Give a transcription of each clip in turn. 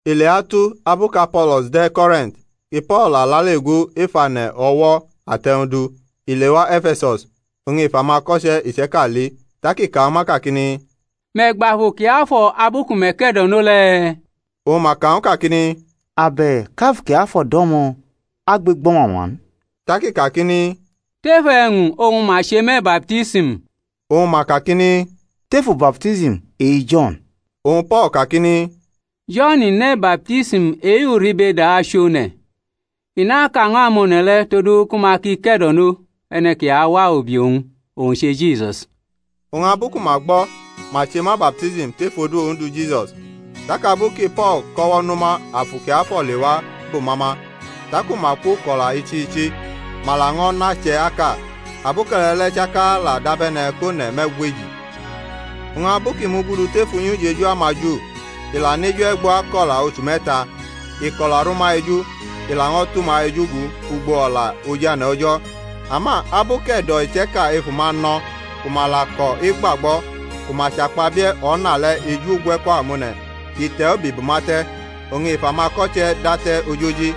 Ileatu abu kʼApolo̩s de̩ Korint ki Po̩l la lale gu ef ane̩ o̩wo̩ ate̩-wñ du i lewa E̩fe̩sus, oñ i fʼamako̩che̩ iche̩ka li, tak i ka ñw ma kakini, Me̩ gbʼAfu Kiafo̩ abu ku me̩ ke̩do̩no le̩? Oñ ma ka ñw u kakini, Abe̩k Afu Kiafo̩ do̩mo̩, a gbʼegbo̩ mama n. Tak i kakini, Tef e̩wñ oñ ma che me̩ baptism? Oñ ma kakini, Tefu baptism e-Jo̩n. Oñ Po̩l kakini, Jo̩n ne̩ baptism e-uribeda achʼone̩, i naka ñw amone̩ le̩ todu ku ma ki ke̩do̩no e̩ne̩ ki awa ubi owñ, owñ che Jisus. Oñ abu ku ma gbo̩, ma che ma baptism tef odu Ondu Jisus. Tak abu ki Po̩l kʼo̩wo̩ nʼuma Afu Kiafo̩ lewa bʼuma ma; taku ma kwoko̩la ichi ichi, ma laño̩ nʼache̩ aka. Aboke̩le̩ le̩ chaka la dabe̩ne̩ kʼone̩ me̩gweji. Oñ abu kʼi mugudu tef unyi ujeju amaJu i la nʼeju e̩gbo ako̩la ochu me̩ta, i kʼo̩la rʼuma eju, i laño̩ tʼuma eju gu ugbo o̩la ojane̩ O̩jo̩. Ama abu kʼe̩do̩ iche̩ka ef uma no̩ ku ma la ko̩ egbagbo̩, ku ma chakpabie̩ O̩na le̩ eju ugwe̩ko̩ amone̩, i te̩ ubi bʼuma te̩, oñ i fʼamako̩che̩ date̩ ojoji,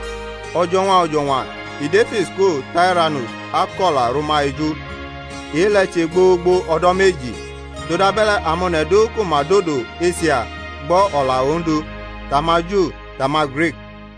o̩jo̩ñwa o̩jo̩ñwa i dʼef iskulu Tairanus akʼo̩la rʼuma eju. E-le̩ che gbogbo o̩do̩ meji; todabe̩le̩ amone̩ du ku ma dodo Esia gbo̩ o̩la Ondu, tʼamaJu, tʼama-Grik.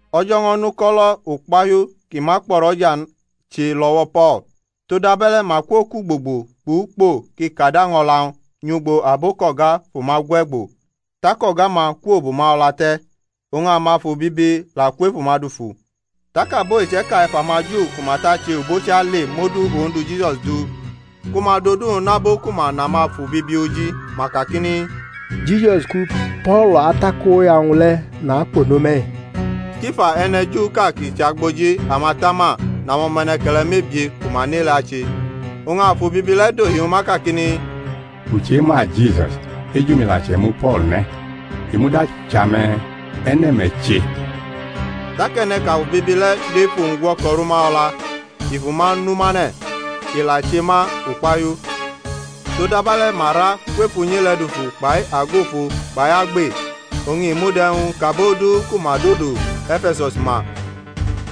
O̩jo̩ ño̩ nʼuko̩lo̩ ukpahiu ki ma kpo̩ rʼo̩ja n che lʼo̩wo̩ Po̩l, todabe̩le̩ ma kwokʼugbogbo kpʼukpo ki kad año̩la-wñ nyʼugbo abo kʼo̩ga fʼuma gwegbo, tak o̩ga-ma kwobʼuma o̩la te̩, oñ amafu bibi la kwʼef uma dufu. Tak abo iche̩ka ef amaJu ku ma tʼache obochi ale mʼodu Ondu Jisusi du ku ma dʼodu-wñ nʼabo ku ma nʼamafu bibi oji, ma kakini, Jisusi ku Po̩l atakoya-wñ le̩ nakpe no me̩-i. Skifa, e̩ne̩ Juʼka kʼi chʼagboji amatama, nʼamo̩me̩ne̩ke̩le̩ mebie ku ma nʼe-le̩ ache. Oñ afu bibi le̩ dohi ñw ma kakini, U chema Jisus, eju-mi la che̩mu Po̩l ne̩; i muda chʼame̩, e̩ne̩ me̩ che? Tak e̩ne̩ kʼafu bibi le̩ dʼef uwñ gwo̩ko̩ rʼuma o̩la, i fʼuma nu mane̩, i la che ma ukpahiu, todabe̩le̩ ma ra kwʼef unyi le̩ dufu kpai ago ofo kpai agbe. Oñ i mud e̩wñ kʼabo du ku ma dodo E̩fe̩sus ma,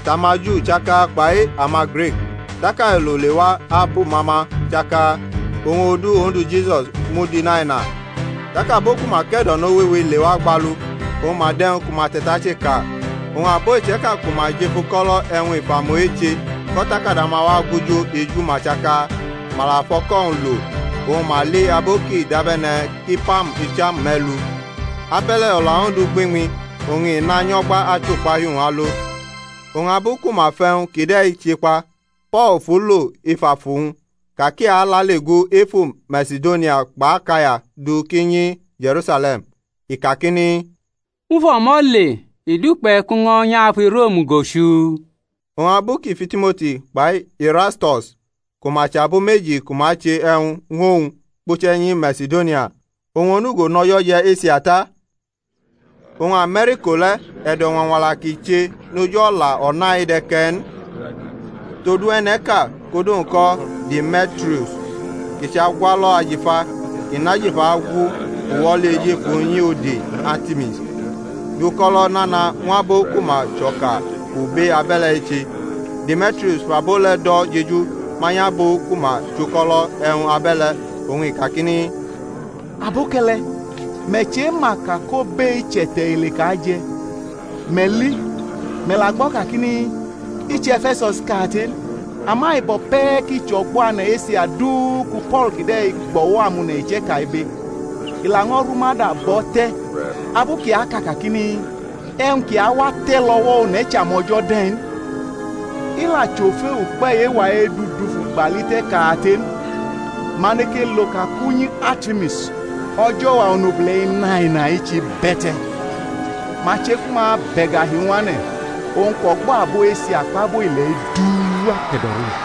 tʼamaJu chaka kpai amaGrik; tak ailo lewa abʼuma ma chaka, oñ odu Ondu Jisusi mud inaina. Tak abo ku ma ke̩do̩no wewe lewa gbalu, oñ ma dʼe̩wñ ku ma te̩tache ka. Oñ abo iche̩ka ku ma jʼef uko̩lo̩ e̩wñ ifamu eche kʼo̩takada-ma wa agujo eju-ma chaka. Ma la fʼoko-wñ lo, oñ ma li abu kʼi dabe̩ne̩ kʼipam icham me̩lu. Abe̩le̩ O̩la Ondu gbiñmi, oñ i nanyo̩gba achʼukpahiu-wñ alo. Oñ abu ku ma fʼe̩wñ kide̩ chekpa, Po̩l fu lo ef afu-wñ ka kʼi alale gu efu Masidonia kpʼAkaya du kʼi nyi Je̩rusale̩m, i kakini, U fʼo̩mo̩ le i dukpe̩ kʼu ño̩ nyʼafu Rom go chuu. Oñ abu kʼi fʼiTimoti kpai Irasto̩s ku ma chʼabo meji ku ma che e̩wñ ñw owñ, kpuche̩ nyi Masidonia, owñ onugo nʼo̩jo̩ je̩ Esia ta. Oñ ame̩rʼiko le̩ e̩do̩ñwañwala ki che noj o̩la O̩na-i de̩ ke̩ n. Todu e̩ne̩ʼka, kʼodu-wñ ko̩ Deme̩trius kʼi chʼagwalo̩ ajifa, kʼi nʼajifa agwu uwo̩li ejefu unyi ode Artimis, dʼuko̩lo̩ nana ñw abo ku ma chʼo̩ka obe abe̩le̩ eche. Deme̩trius fʼabo le̩ do̩ jeju manyʼabo ku ma chʼuko̩lo̩ e̩wñ abe̩le̩, oñ i kakini, Aboke̩le̩, me̩ chema ka kʼobe-i chʼe̩te̩ ile kʼa je̩. Me̩ li, me̩ la gbo̩ kakini, I chʼE̩fe̩sus kate n ama i bo̩ pe̩ ki chʼo̩gbo̩ ane̩ Esia du ku Po̩l kide̩ gbʼo̩wo̩ amone̩ iche̩ka ibe, i laño̩ rʼuma da bʼo̩ te̩, abu kʼi aka kakini, E̩wñ ki awate̩ lʼo̩wo̩ one̩ chʼamo̩jo̩ de̩ n. I la chʼofe ukpe̩ e-wa edʼu dufu gbali te̩ kate n, ma neke lo ka kʼunyi Artimis, o̩jo̩wa onobule̩ inaina-i, chʼibe̩te̩, ma che ku ma bʼe̩gahi-wñ wane̩, owñ kʼo̩gbo̩ abo Esia kpʼabo ile̩ du akpe̩do̩rʼu-i.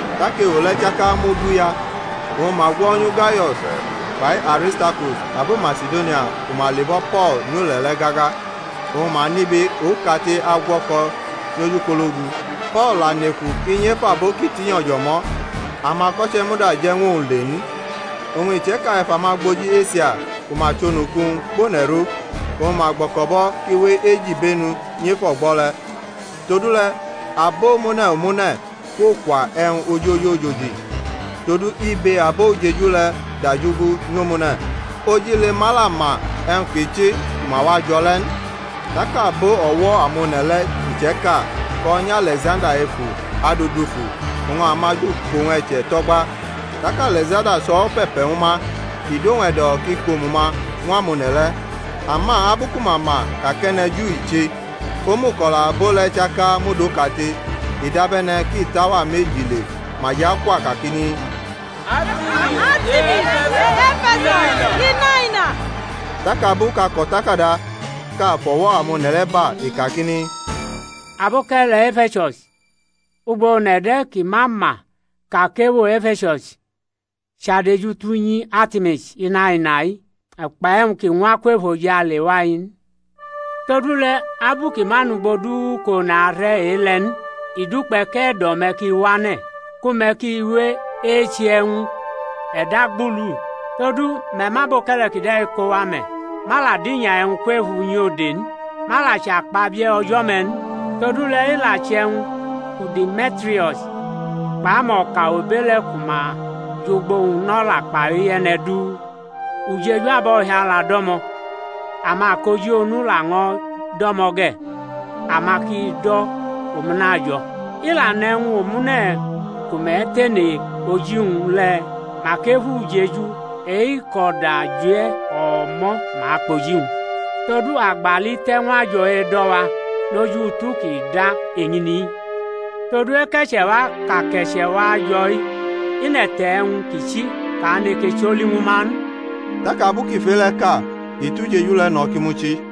Tak ewo le̩ chaka muduya, oñ ma gwo̩nyu Gayo̩s kpai Aristarkus, abo Masidonia ku ma le̩bo̩ Po̩l nyʼule̩ le̩ gaga, oñ ma nʼibe okate agwo̩ko̩ nyʼojukpologu. Po̩l la neku kʼi nyʼef abo kʼi tinyo̩ jʼo̩mo̩, amako̩che̩ muda je̩ ñw owñ le n. Oñ iche̩ka ef amagboji Esia ku ma chʼonuku-wñ kpʼone̩ rʼu, oñ ma gbo̩ko̩bʼo̩ kʼi we ejibenu anyʼef o̩gbo̩ le̩. Todule̩ abomune̩ omune̩ kwokwa e̩wñ ojojojoji; todu ibe abo ujeju le̩ dajugu nyʼomune̩, ojile-ma la ma e̩wñ ki chi ku ma wa jo̩ le̩ n. Tak abo o̩wo̩ amone̩ le̩ iche̩ka ko̩ nyʼAle̩ksanda efu adʼu dufu, oñ amaJu kʼowñ e̩che̩ tʼo̩gba. Tak Ale̩ksanda chʼo̩wo̩ pe̩pe̩ ñw ma, i dʼowñ e̩do̩ kʼi kʼomu-ma ñw amone̩ le̩. Ama abu ku ma ma ka kʼe̩ne̩ Ju i che, omuko̩la abo le̩ chaka mud okate, i dabe̩ne̩ ki tʼauwa meji le ma jʼakwa kakini, Artimis e-E̩fe̩sus inaina! Tak abu kʼako̩takadaʼka fʼo̩wo̩ amone̩ le̩ ba, i kakini, Aboke̩le̩ E̩fe̩sus ugbo one̩ de̩ ki ma ma ka kʼewo E̩fe̩sus chʼadejute̩ unyi Artimis inaina-i kpʼe̩wñ kʼi ñwa kwʼefojale wa-i n? Todule̩ abu ki ma nʼugbo du kʼone̩ are̩ e-le̩ n, i dukpe̩ kʼe̩do̩-me̩ ki wane̩, ku me̩ ki we eche e̩wñ e̩dagbudu. Todu me̩ mʼaboke̩le̩ kide̩ kowa me̩, ma la dinya e̩wñ kwʼef unyi ode n ma la achakpabie o̩jo̩-me̩ n. Todule̩ i la che̩wñ ku Deme̩trius kpʼamo̩ka obe le̩ ku ma jʼugbo-wñ nʼo̩la kpai e̩ne̩ du, ujeju abo̩hiala do̩mo̩, amakoji onu laño̩ do̩mo̩ ge̩: ama ki do̩ omune̩ ajo̩. I la nʼe̩wñ omune̩ ku me̩ tene oji-wñ le̩, mak ef ujeju e-kʼo̩da je̩ o̩mo̩ ma akpʼoji-wñ. Todu a gbali te̩ ñw ajo̩ edo̩-wa noj utu ki da eñini-i, todu eke̩che̩ wa kʼa ke̩che̩ wa jo̩-i nʼe̩te̩ e̩wñ ki chi kʼa neke choli ñw ma n. Tak abu kʼi fʼe-le̩ ka, i tʼujeju le̩ no̩ ki muchi.